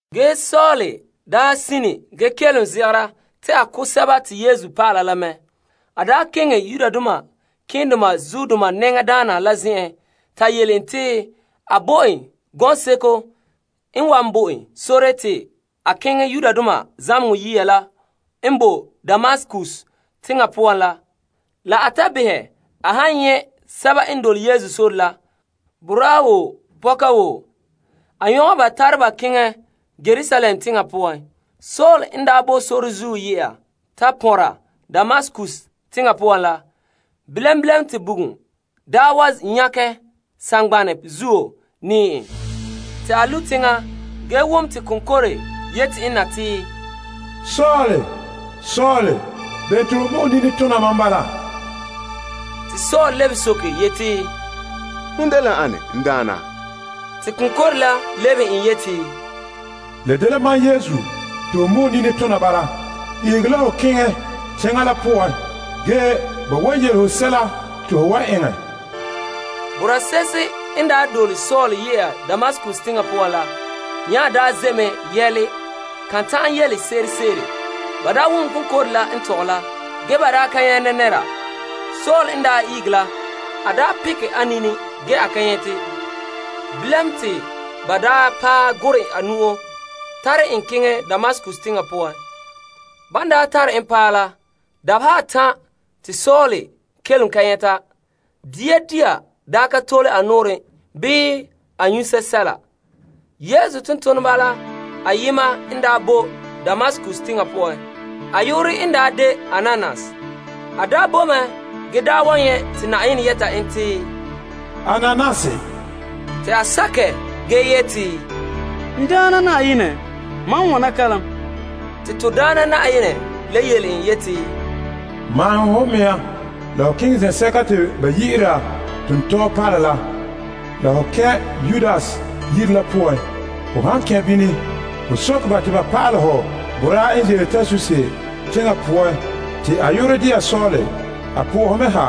Ge Saul daa sine ge kelom zegera te a ko' Yesu dɔlɔba la mɛ te keŋɛ malema nɛŋadaana la zen'en ta yele en te a bo en gɔŋseko n wan bo en sore te a keŋɛ zamehegɔ yiya la n bo Damaskus teŋa poan la. La a ta behɛ a han nyɛ' sɛba n dole Yesu Sore la, boraa wo pɔka wo a nyɔgɛ ba tare ba keŋɛ Yerusalem teŋa poan. Saul n boe sore zuo ye'a ta pɔnra Damaskus teŋa poan la, bilam bilam te bugum wa nyakɛ saŋgbanɛ zuo nɛɛ en. Te a lu' teŋa ge wom te konkore yɛta en na te, Saul, Saul, bene te ho mɔ'ɛn nini tona mam bala? Te Saul lebehe soke yeti, Hon dela ane, n Daana? Te konkore la lebehe yele n yeti, La dela mam, Yesu te ho mɔ'ɛn nini tona bala. Ihege la ho keŋɛ kɛn' teŋa la poan ge ba wan yele ho sɛla te ho wan eŋɛ. Boraa se'ehe n dole Saul ye'a Damaskus teŋa poan la, nya ze' mɛ yɛla. Ka ta'an yelese'ere. Ba wom konkore la n tɔgɛ la, ge ba ka nyɛ' nɛra. Saul n daa ihege la, a pekɛ a nini ge a ka nyɛte. Bilam te ba paɛ gurɛ a nu'o tare en keŋɛ Damaskus teŋa poan. Ban daa tare en paɛ la, dabeha atan' te Saul kelom ka nyɛta. Dia ka tole a nɔɔrɛn bii a nyu' sɛla. Yesu tontoneba la ayema n daa bo Damaskus teŋa poan te a yu'urɛ dela Ananias. A daa boe mɛ ge nyɛ' liligere te Na'ayenɛ yɛta en te, Ananias. Te a sakɛ ge yeti, N Daana Na'ayenɛ, mam wana kalam. Te Na'ayenɛ la le yele en yeti, Maahom ho mea la ho keŋɛ zen'sɛka te ba yi'ira Tontɔɔ Palɛ la, la ho kɛn' Yudas yire la poan. Ho han kɛn' bini, ho soke ba te ba pa'alɛ ho boraa n ze'ele Tarsus teŋa poan te a yu'urɛ de'a Saul. A po'ohe mɛ ha,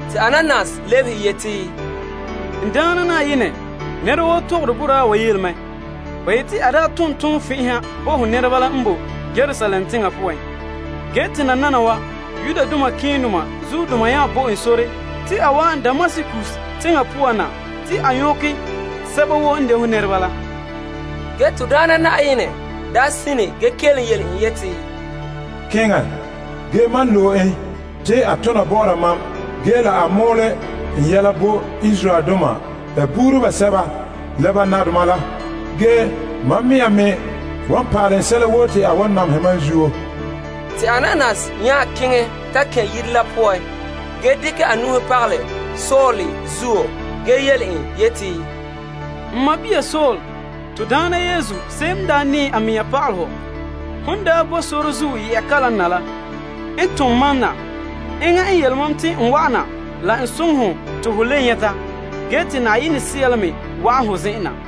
Te Ananias lebehe yeti, N Daana Na'ayenɛ, nɛra woo tɔgɔre boraa wa yele mɛ. Ba yete a daa tom tonfɛn'ɛha bo ho nɛreba la n boe Yerusalem teŋa poan. Ge te nananawa malema keendoma nya bo en sore te a wa'an Damaskus teŋa poan na te a nyɔkɛ sɛba woo n de ho nɛreba la. Ge Na'ayenɛ sine ge kelom yele en yeti, Keŋɛ, ge mam loe en te a tona bɔ'ɔra mam ge la a mɔɔlɛ n yɛla bo Yudoma la sɛba n dagɛ Yudoma la, la nadoma. Ge mam mea me wan pa'alɛ en sɛla woo te a wan namehɛ mam zuo. Te Ananias nya keŋɛ ta kɛn' yire la poan ge dekɛ a nu'uhe pagalɛ Saul zuo ge yele en yeti, N sɔɔn Saul to Daana Yesu se'em n daa nɛɛ a mɛŋa pa'alɛ ho, hon daa boe sore la zuo ye'a kalam na la, n tom mam na. Enŋa n yele mam te n wa'an na la n soŋɛ hɔ te ho le nyɛta ge te Yenɛ Sea la me wa'an ho zen'en na.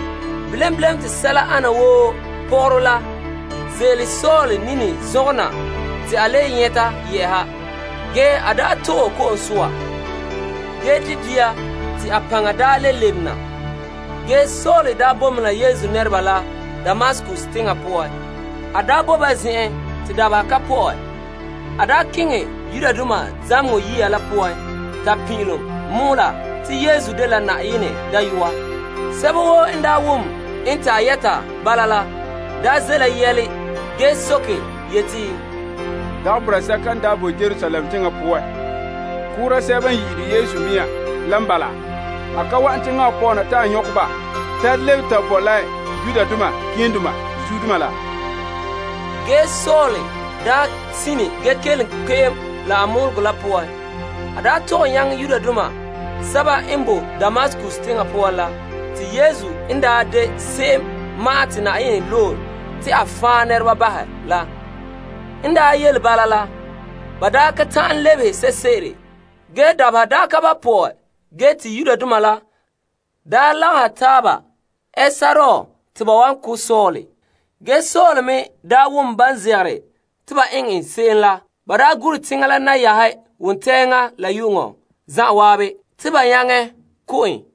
Bilam bilam te sɛla ane wo pɔgɔrɔ la ze'ele Saul nini la zɔngɛ na te a le nyɛta yɛ'ɛha. Ge te a to'e ko'om soa ge di' dia te a paŋa daa le lebe na. Ge te a boe mɛ la Yesu nɛreba zen'en Damaskus teŋa poan te dabeha ka pɔ'ɛ. A ne keŋɛ zamehegɔ yiya la poan ta pin'ilom mɔɔla te Yesu dela Yenɛ Dayɔa. Sɛba woo n wom en te a yɛta bala la, ze' la yɛle ge soke yeti, Dagɛ boraa sɛka n daa boe Yerusalem teŋa poan koora sɛba n yi'ire Yesu mea la n bala? A ka wa'an teŋa wa poan na te a nyɔkɛ ba tare lebe ta bo la malema keendoma la? Ge Saul sine ge kelom kpe'em la a mɔɔlegɔ la poan. A tɔgɛ nyaŋɛ Yudoma sɛba n boe Damaskus teŋa poan la te Yesu n daa de se'em ma'an te Yenɛ loe la. N daa yele bala la, ba ka ta'an lebehe se'ere. Dabeha daa ka ba' pɔ'ɛ ge te Yudoma la lagahɛ taaba ɛ sɔrɔɔ te ba ko' Saul. Ge Saul me wom ban zegere te ba eŋɛ n se'em la. Ba gure teŋa la nayahe wontɛŋa la yu'uŋɔ zan'an te ba nyaŋɛ ko' en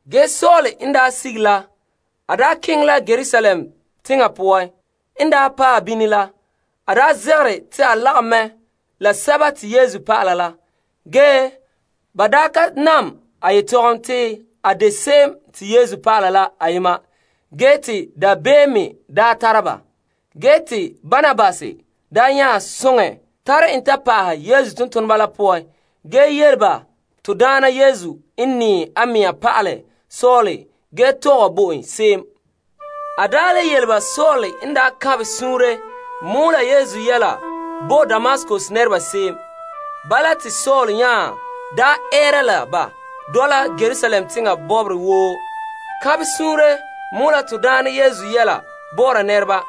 Te Saul keŋɛ la Yerusalem teŋa poan. En paɛ bini la, a zegere te a lagom mɛ la Yesu dɔlɔba la, ge ba ka nam a yetɔgom te a de se'em te Yesu dɔlɔba ayema ge te dabeem me tara ba. Ge te Barnabas nya soŋɛ tare en ta pa'ahɛ Yesu tontoneba la poan ge yele ba to Daana n nɛɛ a mea pa'alɛ Saul ge tɔgɛ bo en se'em. A le yele ba Saul n daa kanbɛ suunre mɔɔlɛ Yesu yɛla bo Damaskus nɛreba se'em. Bala te Saul nya dɔla ba Yerusalem teŋa bɔbɔrɛ woo kanbɛ suunre mɔɔla to Daana Yesu yɛla bɔ'ɔra nɛreba.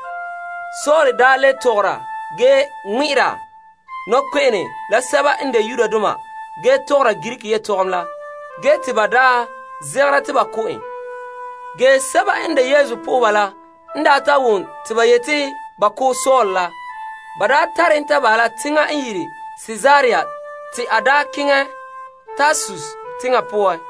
Saul le tɔgɔra ge ŋmɛ'ɛra nɔkpe'ene la sɛba n de Yudoma ge tɔgɔra Greek yetɔgom la, ge te ba zegera te ba ko' en. Ge Yesu po'oheba la n wom te ba yete te ba ko' Saul la, ba tare en ta bahɛ la Kaesarea teŋa te a keŋɛ Tarsus teŋa poan.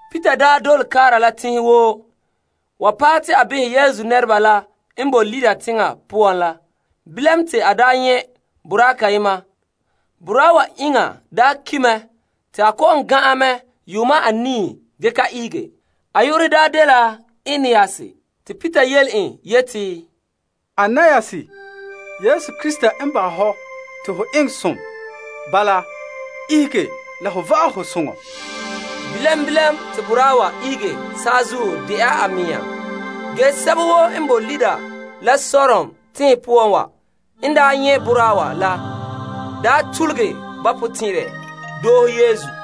Peter la n daa dole kaara la teŋhe woo paɛ te a behɛ Yesu nɛreba la n boe Lidda teŋa poan la. Bilam te a nyɛ' boraa kayema. Boraa wa iŋa ki' mɛ te a kɔ'ɔn gan'an mɛ yuuma anii ge ka ihege. A yu'urɛ dela Aeneas. Te Peter yele en yeti, Aeneas, Yesu Krista n bahɛ ho te ho eŋɛ som. Bala la, ihege la ho vaɛ ho soŋɔ. Bilam bilam te boraa wa ihege saazuo de'a a mea. Ge sɛba woo n bo Lidda la Saron teŋhe poan wa n nyɛ' boraa wa la, tuluge ba potɛn'ɛrɛ doohe Yesu.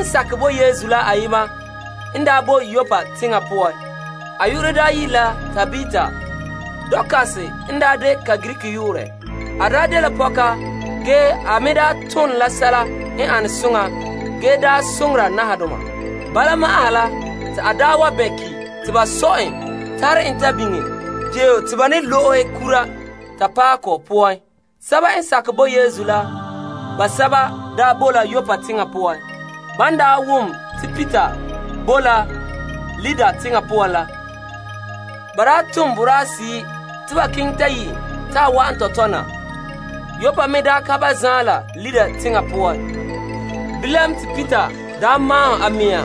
Yesu dɔlɔba ayema n boe Yoppa teŋa poan te a yu'urɛ dela Tabita. Dorkas n de ka Greek yu'urɛ. A dela pɔka ge a me daa tone la sɛla n ane soŋa ge soŋora nahadoma. Bala ma'an ha la te a bɛn' ki' te ba sɔ en tare en ta biŋe deo te ba ne lo'ehe kura ta paɛ kɔ poan. Yesu nɛreba basɛba bo la Yoppa teŋa poan. Ban ta wom te Peter bo la Lidda teŋa poan la, ba tom boraahe seyi' te ba keŋɛ ta yi' en te a wa'an tɔtɔ tɔtɔ na. Yoppa me ka ba zaan la Lidda teŋa poan. Bilam te Peter maahom a mea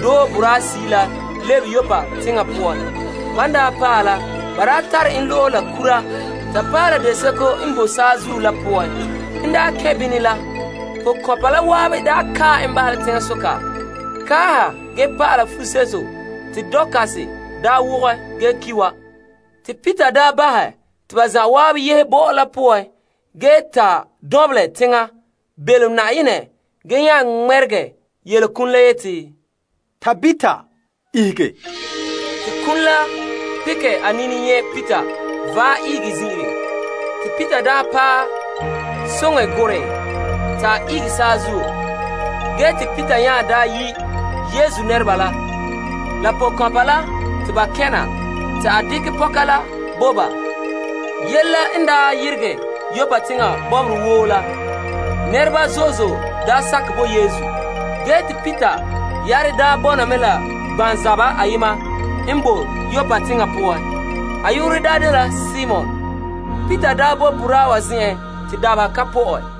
doohe boraahe seyi' la lebe Yoppa teŋa poan. Ban paɛ la, ba tare en lo'ehe la kura ta paɛ la deseko n boe saazuo la poan. En kɛn' bini la, pɔkɔnpa la zan'an kae en bahɛ la teŋasoka kaaha ge pa'ala fuseto te Dorkas daa wogɔ ge ki' wa. Te Peter bahɛ te ba zan'an yehe bɔ'ɔ la poan ge ta dɔnbelɛ teŋa belom Yenɛ ge nya ŋmɛregɛ yele kum la yeti, Tabita, ihege. Te kum la pekɛ a nini nyɛ' Peter vaɛ ihege zin'ire. Te Peter paɛ soŋɛ gurɛ en te a ihege saazuo. Ge te Peter nya yi' Yesu nɛreba la pɔkɔnpa la te ba kɛn' na. Te a dekɛ pɔka la bo ba. Yele la n yeregɛ Yoppa teŋa bɔbɔrɛ woo la, nɛreba zo'e zo'e sakɛ bo Yesu. Ge te Peter yare bɔna mɛ la gbanzaba ayema n boe Yoppa teŋa poan te a yu'urɛ dela Simon. Peter boe boraa wa zen'en te dabeha ka pɔ'ɛ.